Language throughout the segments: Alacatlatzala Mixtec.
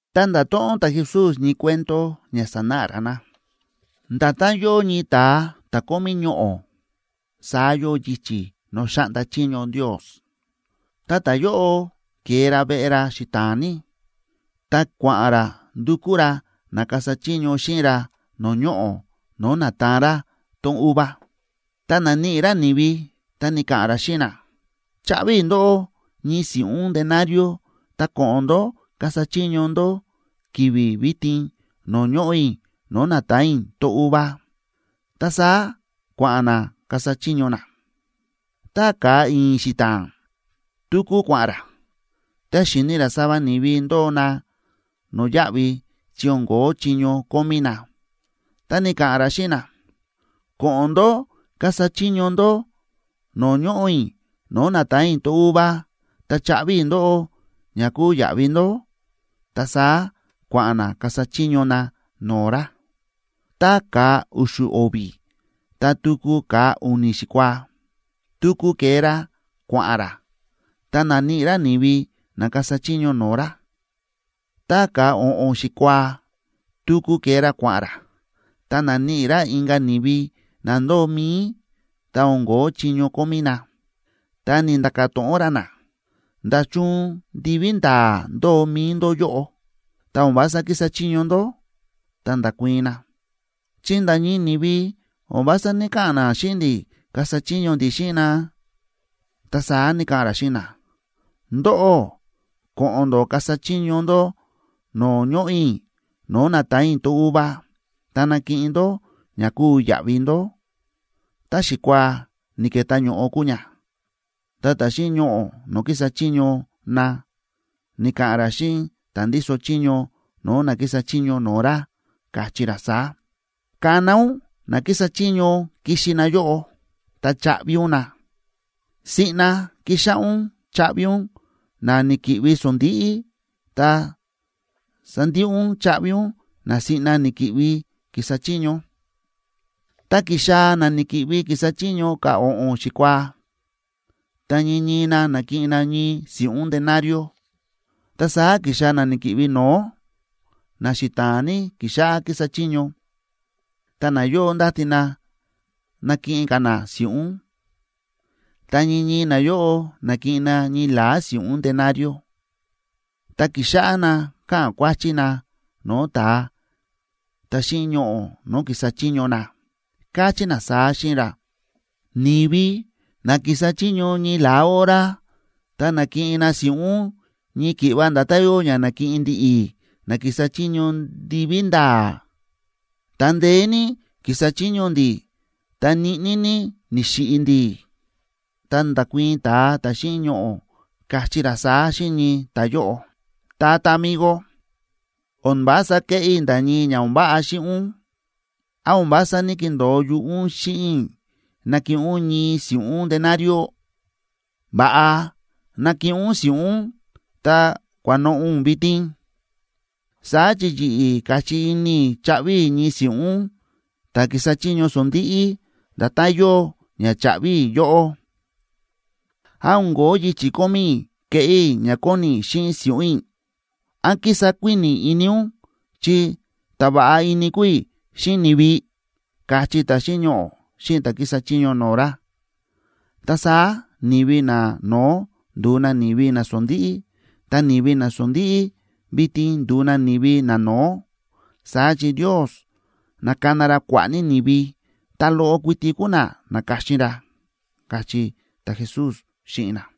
Ta nda̱to̱ꞌon ta̱Jesús ñii cuento ña sanáꞌa ra na: ―Nda̱tán yóo ñii ta̱a ta̱ kómí ñoꞌo̱, saá yóo yichi̱ no̱o̱ xáꞌnda chiño Ndios. Ta ta̱yóꞌo ke̱e ra veꞌe ra xita̱a̱n ní, ta kua̱ꞌa̱n ra ndukú ra na kasa chiño xíꞌin ra no̱o̱ ñoꞌo̱ no̱o̱ na̱taan ra tón uva. Ta na̱níꞌi ra ni̱vi, ta ni̱ka̱ꞌa̱n ra xíꞌin na: “Chaꞌvi i̱ ndóꞌó ñii si̱ꞌún denarioa tá ko̱ꞌo̱n ndó kasa chiño ndó ki̱vi̱ vitin no̱o̱ ñoꞌo̱ i̱ no̱o̱ na̱taan i̱ tón uva.” Ta saá kua̱ꞌa̱n na kasa chiño na. Ta ka̱a i̱i̱n xita̱a̱nb tuku kua̱ꞌa̱n ra, ta xi̱ni ra sava ni̱vi ndóo na no̱yáꞌvi chi o̱n ko̱ó chiño kómí na. Ta ni̱ka̱ꞌa̱n ra xíꞌin na: “Ko̱ꞌo̱n ndó kasa chiño ndó no̱o̱ ñoꞌo̱ i̱ no̱o̱ na̱taan i̱ tón uva, ta chaꞌvi i̱ ndóꞌó ña kúu yaꞌvi ndó.” Ta saá kua̱ꞌa̱n na kasa chiño na no̱o̱ ra. Ta ka̱a u̱xu̱ o̱vi̱ ta tuku ka̱a u̱ni̱ xikuaac tuku ke̱e ra kua̱ꞌa̱n ra, ta na̱níꞌi ra ni̱vi na kasa chiño no̱o̱ ra. Ta ka̱a o̱ꞌo̱n xikuaad tuku ke̱e ra kua̱ꞌa̱n ra, ta na̱níꞌi ra inka̱ ni̱vi na ndóo mi̱i ta o̱n ko̱ó chiño kómí na. Ta ni̱nda̱ka̱ to̱ꞌon ra na: “¿Nda̱chun ndiví nda̱a̱ ndóo mi̱i ndó yóꞌo, ta o̱n vása kísa chiño ndó?” Ta nda̱kuii̱n na: “Chi nda̱ ñii ni̱vi o̱n vása ní‑kaꞌa̱n xíꞌin ndi̱ kasa chiño ndi̱ xíꞌin na.” Ta saá ni̱ka̱ꞌa̱n ra xíꞌin na: “Ndóꞌó ko̱ꞌo̱n ndó kasa chiño ndó no̱o̱ ñoꞌo̱ i̱ no̱o̱ na̱taan i̱ tón uva, ta nakiꞌin ndó ña kúu yaꞌvi ndó.” Tá xikuaa ni̱ke̱tá ño̱ꞌo kúu ña, ta ta̱ xíꞌin ñoꞌo̱ no̱o̱ kísa chiño na ni̱ka̱ꞌa̱n ra xíꞌin ta̱ ndíso chiño no̱o̱ na kísa chiño no̱o̱ ra, káchí ra saá: “Kana ún na kísa chiño kixi na yóꞌo, ta chaꞌvi ún na. Siꞌna kixáꞌá ún chaꞌvi ún na ni̱ki̱ꞌvi sondíꞌí, ta sandiꞌi ún chaꞌvi ún na siꞌna ni̱ki̱ꞌvi ki̱sa chiño.” Ta ki̱xaa̱ na ni̱ki̱ꞌvi ki̱sa chiño ka̱a o̱ꞌo̱n xikuaa, ta ñii ñii na na̱kiꞌin na ñii si̱ꞌún denario. Ta saá ki̱xaa̱ na ni̱ki̱ꞌvi no̱ó na xita̱a̱n ní ki̱xáꞌá ki̱sa chiño, ta nayóꞌo ndáti na nakiꞌin ka̱ na si̱ꞌún. Ta ñii ñii nayóꞌo na̱kiꞌin na ñii la̱á si̱ꞌún denario. Ta ki̱xáꞌá na káꞌa̱n kuáchí na no̱o̱ ta̱a ta̱ xíꞌin ñoꞌo̱ no̱o̱ ki̱sa chiño na, káchí na saá xíꞌin ra: “Ni̱vi na ki̱sa chiño ñii la̱á hora, ta na̱kiꞌin na si̱ꞌún ñii ki̱ꞌva nda̱tán yóo ña na̱kiꞌin ndi̱ꞌi̱ na ki̱sa chiño ndiví nda̱a̱, ta ndeé ní ki̱sa chiño ndi̱ ta ñiꞌní ní ni̱xiꞌi̱ ndi̱.” Ta nda̱kuii̱n ta̱a ta̱ xíꞌin ñoꞌo̱, káchí ra saá xíꞌin ñii ta̱yóꞌo: “Tata migo, o̱n vása kéꞌé i̱ nda̱ ñii ña o̱n váꞌa xíꞌin ún. ¿Án o̱n vása ní‑kindo̱o yuꞌú ún xíꞌin i̱ nakiꞌin ún ñii si̱ꞌún denario? Va̱ꞌa ná kiꞌin ún si̱ꞌún ún ta kua̱noꞌo̱ ún vitin. Saá chi yi̱ꞌi̱ káchí ini i̱ chaꞌvi i̱ ñii si̱ꞌún ta̱ kísa chiño sondíꞌí nda̱tán yóo ña cha̱ꞌvi i̱ yóꞌó. ¿Án o̱n ko̱ó yichi̱ kómí i̱ keꞌé i̱ ña kóni i̱ xíꞌin si̱ꞌún i̱? ¿Án kísa kuíni̱ ini ún chi ta̱ va̱ꞌa ini kúu i̱ xíꞌin ni̱vi?”, káchí ta̱ xíꞌin ñoꞌo̱ xíꞌin ta̱ kísa chiño no̱o̱ ra. Ta saá ni̱vi nano̱ó nduu na ni̱vi nasondíꞌí, ta ni̱vi nasondíꞌí vitin nduu na ni̱vi nano̱ó. Saá chi Ndios nákana ra kua̱ꞌa̱ ní ni̱vi, ta loꞌo kuiti kúu na na̱ka̱xin ra ―káchí ta̱Jesús xíꞌin na.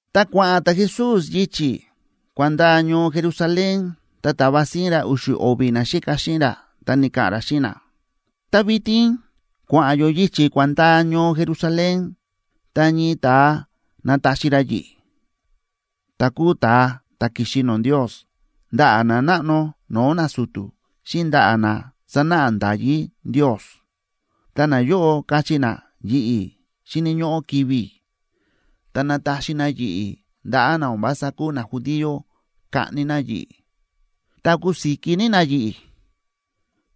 Ta kua̱ꞌa̱n ta̱Jesús yichi̱ kua̱n ndaa ñoo Jerusalén, ta ta̱va síín ra u̱xu̱ o̱vi̱ naxíka xíꞌin ra, ta ni̱ka̱ꞌa̱n ra xíꞌin na: ―Ta vitin kua̱ꞌa̱n yó yichi̱ kua̱n ndaa ñoo Jerusalén, ta ñii ta̱a nataxi ra yi̱ꞌi̱, ta̱ kúu ta̱a ta̱ ki̱xi no̱o̱ Ndios, ndaꞌa̱ nanáꞌno no̱o̱ nasu̱tu̱, xíꞌin ndaꞌa̱ na sánáꞌa nda̱yí Ndios. Ta nayóꞌo kachí na yi̱ꞌi̱ xíni̱ ñóꞌó kivi̱ i̱, ta nataxi na yi̱ꞌi̱ ndaꞌa̱ na o̱n vása kúu najudío kaꞌni na yi̱ꞌi̱. Ta kusiki ní na yi̱ꞌi̱,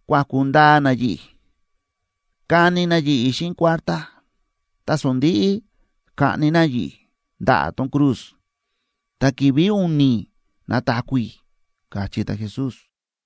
kuaku̱ ndaa na yi̱ꞌi̱, kani ní na yi̱ꞌi̱ xíꞌin kuártá, ta sondi̱ꞌi kaꞌni na yi̱ꞌi̱ ndaꞌa̱ tón cruz. Ta ki̱vi̱ u̱ni̱ nataku̱ i̱ ―káchí ta̱Jesús.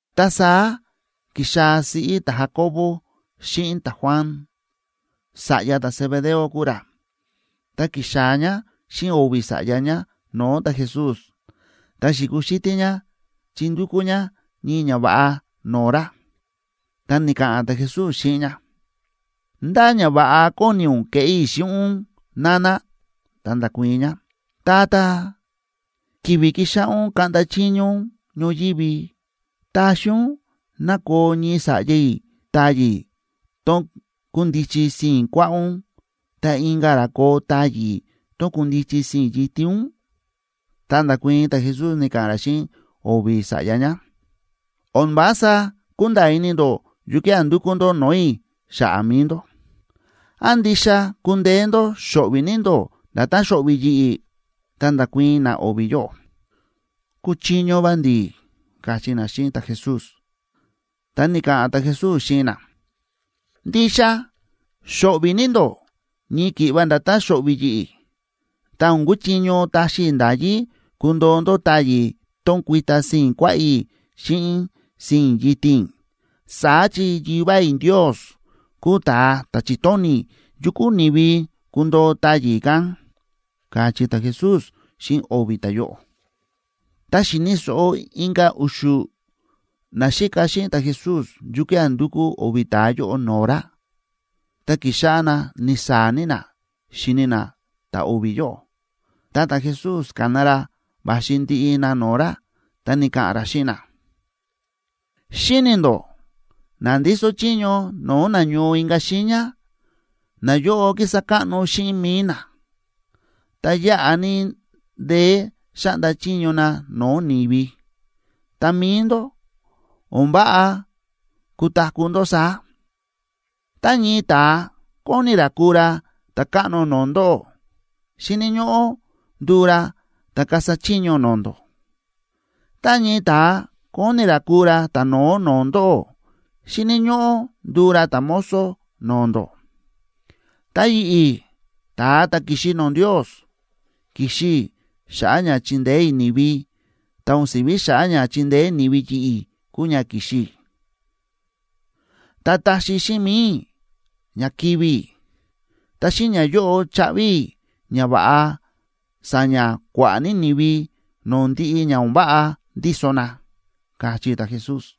Ta saá ki̱xaa̱ siꞌí ta̱Jacoboe xíꞌin ta̱Juan, sa̱ꞌya ta̱Zebedeo kúu ra, ta ki̱xaa̱ ñá xíꞌin o̱vi̱ sa̱ꞌya ñá no̱o̱ ta̱Jesús, ta xi̱kuxítí ñá chi ndukú ñá ñii ñava̱ꞌa no̱o̱ ra. Ta ni̱ka̱ꞌa̱n ta̱Jesús xíꞌin ñá: ―¿Ndá ñava̱ꞌa kóni ún keꞌé i̱ xíꞌin ún?, nana. Ta nda̱kuii̱n ñá: ―Tata, ki̱vi̱ kixáꞌá ún kaꞌnda chiño ún ñoyívi, taxi ún ná koo ñii sa̱ꞌya i̱ táyi̱ tón kundichi sii̱n kuaꞌá ún ta inka̱ ra koo táyi̱ tón kundichi sii̱n yitin ún. Ta nda̱kuii̱n ta̱Jesús, ni̱ka̱ꞌa̱n ra xíꞌin o̱vi̱ sa̱ꞌya ñá: ―O̱n vása kúnda̱a̱ ini ndó yukía̱ ndúkú ndó no̱o̱ i̱ xa̱ꞌa̱ mi̱i ndó. ¿Án ndixa kúndeé ndó xo̱ꞌvi̱ ní ndó nda̱tán xo̱ꞌvi̱ yi̱ꞌi̱? Ta nda̱kuii̱n na o̱vi̱ yóꞌo: ―Kúchiño va ndi̱ ―káchí na xíꞌin ta̱Jesús. Ta ni̱ka̱ꞌa̱n ta̱Jesús xíꞌin na: ―Ndixa xo̱ꞌvi̱ ní ndó ñii ki̱ꞌva nda̱tán xo̱ꞌvi̱ yi̱ꞌi̱. Ta o̱n kuchiño taxi i̱ nda̱yí kundoo ndó táyi̱ tón kuita sii̱n kuaꞌá i̱ xíꞌin sii̱n yitin i̱. Saá chi Yivá i̱ Ndios kúu ta̱a ta̱ chi̱tóni̱ yu kúu ni̱vi kundoo táyi̱ kán ―káchí ta̱Jesús xíꞌin o̱vi̱ ta̱yóꞌo. Ta xi̱ni̱ so̱ꞌo inka̱ u̱xu̱ naxíka xíꞌin ta̱Jesús yukía̱ ndu̱kú o̱vi̱ ta̱a yóꞌo no̱o̱ ra, ta ki̱xáꞌá na ni̱saa̱ ní na xíni na ta̱ o̱vi̱ yóꞌo. Ta ta̱Jesús ka̱na ra va̱xi ndiꞌi na no̱o̱ ra, ta ni̱ka̱ꞌa̱n ra xíꞌin na: ―Xíni̱ ndó na ndíso chiño no̱o̱ na ñoo inka̱ xiiña, nayóꞌo kísa káꞌno xíꞌin mi̱i na, ta yáꞌa ní ndeé xáꞌnda chiño na no̱o̱ ni̱vi. Ta mi̱i ndó, o̱n váꞌa kutaku̱ ndó saá. Tá ñii ta̱a kóni ra kuu ra ta̱káꞌno no̱o̱ ndóꞌó, xíni̱ ñóꞌó nduu ra ta̱ kasa chiño no̱o̱ ndó. Tá ñii ta̱a kóni ra kuu ra ta̱no̱ó no̱o̱ ndóꞌó, xíni̱ ñóꞌó nduu ra ta̱mozo no̱o̱ ndó. Ta yi̱ꞌi̱, ta̱a ta̱ ki̱xi no̱o̱ Ndios, ki̱xi i̱ xa̱ꞌa̱ ña chindeé i̱ ni̱vi, ta o̱n si̱ví xa̱ꞌa̱ ña chindeé ni̱vi yi̱ꞌi̱ kúu ña ki̱xi i̱. Ta taxi xíꞌin mi̱i i̱ ña kivi̱ i̱, ta xíꞌin ñayóꞌo chaꞌvi i̱ ña va̱ꞌa sa̱ña̱ kua̱ꞌa̱ ní ni̱vi no̱o̱ ndiꞌi ña o̱n váꞌa ndíso na ―káchí ta̱Jesús.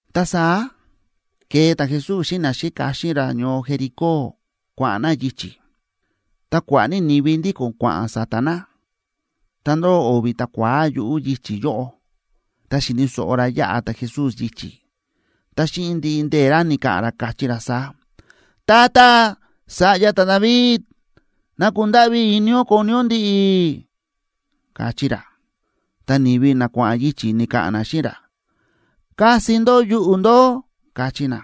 Ta saá ke̱e ta̱Jesús xíꞌin naxíka xíꞌin ra ñoo Jericó, kua̱ꞌa̱n na yichi̱, ta kua̱ꞌa̱ ní ni̱vi ndíko̱n kua̱ꞌa̱n sa̱ta̱ na. Ta ndóo o̱vi̱ ta̱kua̱á yuꞌu̱ yichi̱ yóꞌo, ta xi̱ni̱ so̱ꞌo ra yáꞌa ta̱Jesús yichi̱, ta xíꞌin ndiꞌi ndee̱ ra ni̱ka̱ꞌa̱n ra, káchí ra saá: ―Tata, sa̱ꞌya ta̱David, ¡ná kundáꞌví ini ún koni ún ndi̱ꞌi̱! ―káchí ra. Ta ni̱vi na kua̱ꞌa̱n yichi̱ ni̱ka̱ꞌa̱n na xíꞌin ra: ―¡Kasi ndó yuꞌu̱ ndó! ―káchí na.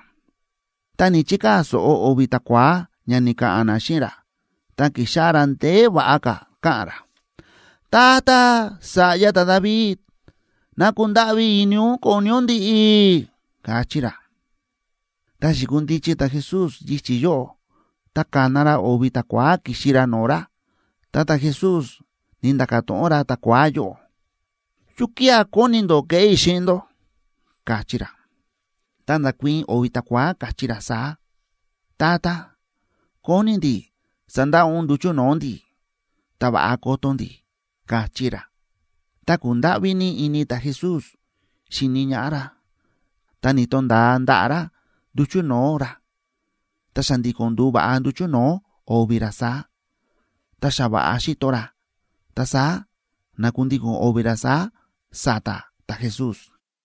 Ta ni̱‑chikaa̱ so̱ꞌo o̱vi̱ ta̱kua̱á ña ni̱ka̱ꞌa̱n na xíꞌin ra, ta ki̱xáꞌá ra ndeé va̱ꞌa ka̱ káꞌa̱n ra: ―Tata, sa̱ꞌya ta̱David, ¡ná kundáꞌví ini ún koni ún ndi̱ꞌi̱! ―káchí ra. Ta xi̱kundichi ta̱Jesús yichi̱ yóꞌo, ta ka̱na ra o̱vi̱ ta̱kua̱á kixi ra no̱o̱ ra, ta ta̱Jesús ni̱nda̱ka̱ to̱ꞌon ra ta̱kua̱á yóꞌo: ―¿Yukía̱ kóni ndó keꞌé i̱ xíꞌin ndó? ―káchí ra. Ta nda̱kuii̱n o̱vi̱ ta̱kua̱á, káchí ra saá: ―Tata, kóni ndi̱ sandaꞌa ún nduchu̱ no̱o̱ ndi̱, ta va̱ꞌa koto ndi̱ ―káchí ra. Ta ku̱ndáꞌví ní ini ta̱Jesús xi̱ni ñaꞌá ra, ta ni̱to̱nda̱a ndaꞌa̱ ra nduchu̱ no̱o̱ ra. Ta xa̱ndi̱ko̱n ndu̱va̱ꞌa nduchu̱ no̱o̱ o̱vi̱ ra saá, ta xa va̱ꞌa xíto ra, ta saá na̱kundíko̱n o̱vi̱ ra saá sa̱ta̱ ta̱Jesús.